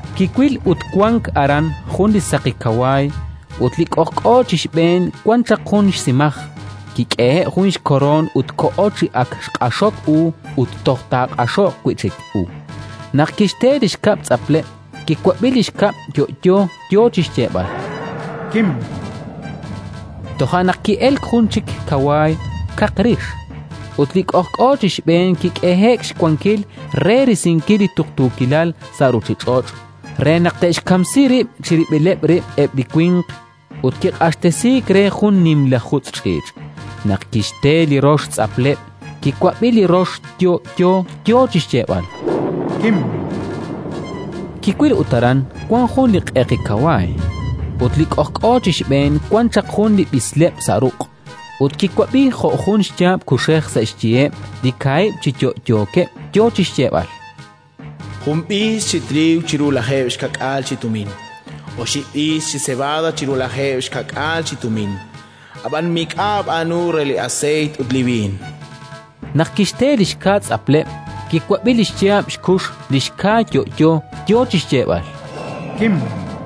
Kiwil, ut wank aran jun li saqi kawaay; ut li k'ojk'o chi xb'een wan chaq jun xsimaj. Kik'ehe'k jun xkoroon ut koho chi ak xq'axok u ut toj taaq'axoq wi' chik u. Naq kixte li xkab' tz'apleb', kiwab'i li xkab' yo'yo, yo chi xyeeb'al: “Kim”. Toja' naq ki'elk jun chik kawaay, kaq rix, ut li k'ojk'o chi xb'een kik'ehe'k xwankil re risinkil li tuqtuukilal sa' ruuchich'och', re naq te'xkamsi rib' chirib'ileb' rib' eb' li winq; ut kiq'axtesiik re jun li nimla jutz' ch'iich'. Naq kixte li rox tz'apleb', kiwab'i li rox yo'yo, yo chi xyeeb'al: “Kim”. Kiwil, ut aran wank jun li q'eqi kawaay, ut li k'ojk'o chi xb'een wan chaq jun li b'isleb' sa' ruq'. Ut kiwab'i jo' jun xyaab' kuxej sa' xyiheb' li kaahib' chi yo'yookeb', yo chi xyeeb'al: “Jun b'iis chi triiw chiru lajeeb' xka'k'aal chi tumin, oxib' b'iis chi sebada chiru lajeeb' xka'k'aal chi tumin; ab'an mik'a' aab'aanu re li aseeyt ut li b'iin”. Naq kixte li xka tz'apleb', kiwab'i li xyaab' xkux li xka yo'yo, yo chi xyeeb'al: “Kim”.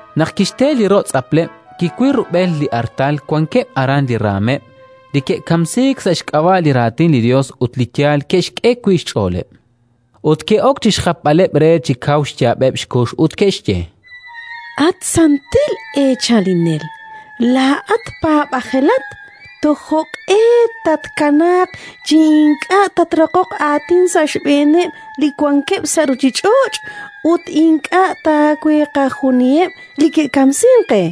Naq kixte li ro' tz'apleb', kiwil rub'el li artal wankeb' aran li raanmeb' li ke'kamsiik sa' xk'ab'a' li Raatin li Yos ut li yaal ke'xk'e wi' xch'ooleb'. Ut ke'ok chi xjapb'aleb' re chi kaw xyaab'eb' xkux, ut ke'xye: “At santil Eechalinel, laa'at paab'ajelat, toj jo'q'e tatkanaaq chi ink'a' tatraqoq aatin sa' xb'eeneb' li wankeb' sa' ruuchich'och' ut ink'a' taweeqajuniheb' li ke'kamsink qe?”.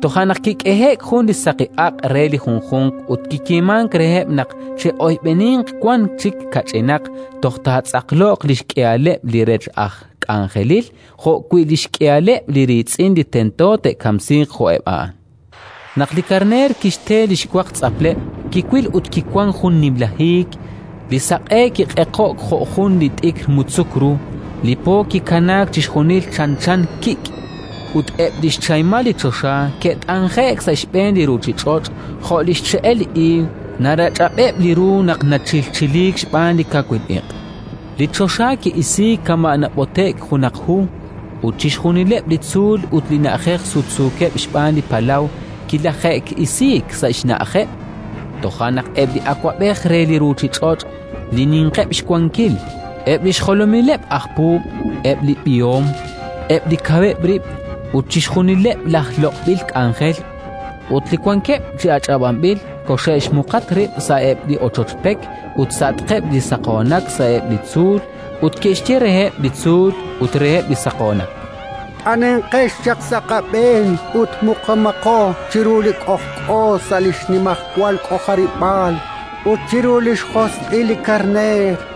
Toja' naq kik'ehe'k jun li saqi aq' re li junjunq ut kiyeemank reheb' naq che'oyb'eninq wan chik kach'inaq toj taatz'aqloq li xk'ihaleb' li rech aj k'anjelil jo'wi' li xk'ihaleb' li riitz'in li tento te'kamsiiq jo'eb' a'an. Naq li Karneer kixte li xwaq tz'apleb', kiwil, ut kiwank jun nimla hiik; li saq'e kiq'eqo'k jo' jun li t'ikr mutzuk ru, li po kikanaak chixjunil chanchan kik' ut eb' li xchahimal li choxa ke't'anje'k sa' xb'een li ruuchich'och', jo' li xche'el li iig narach'ab'eb' li ru naq nachilchiliik xb'aan li kawil iq'. Li choxa ki'isiik kama' nab'ote'k junaq hu, ut chixjunileb' li tzuul ut li na'ajej sutsuukeb' xb'aan li palaw kilaje'eek'asiik sa' xna'ajeb'. Toja' naq eb' li awab'ej re li ruuchich'och', li ninqeb' xwankil, eb' li xjolomileb' laj puub', eb' li b'ihom, eb' li kaweb' rib' ut chixjunileb' laj loq'b'il k'anjel ut li wankeb' chi ach'ab'anb'il, koxe'xmuqatq rib' sa'eb' li ochoch pek ut sa'atqeb' li saqoonak sa'eb' li tzuul; ut ke'xye reheb' li tzuul ut reheb' li saqoonak: “T'anenqex chaq sa' qab'een ut muqumaqo chiru li k'ojk'o sa' li xnimajwal k'ojarib'aal ut chiru li xjosq'il li Karneer!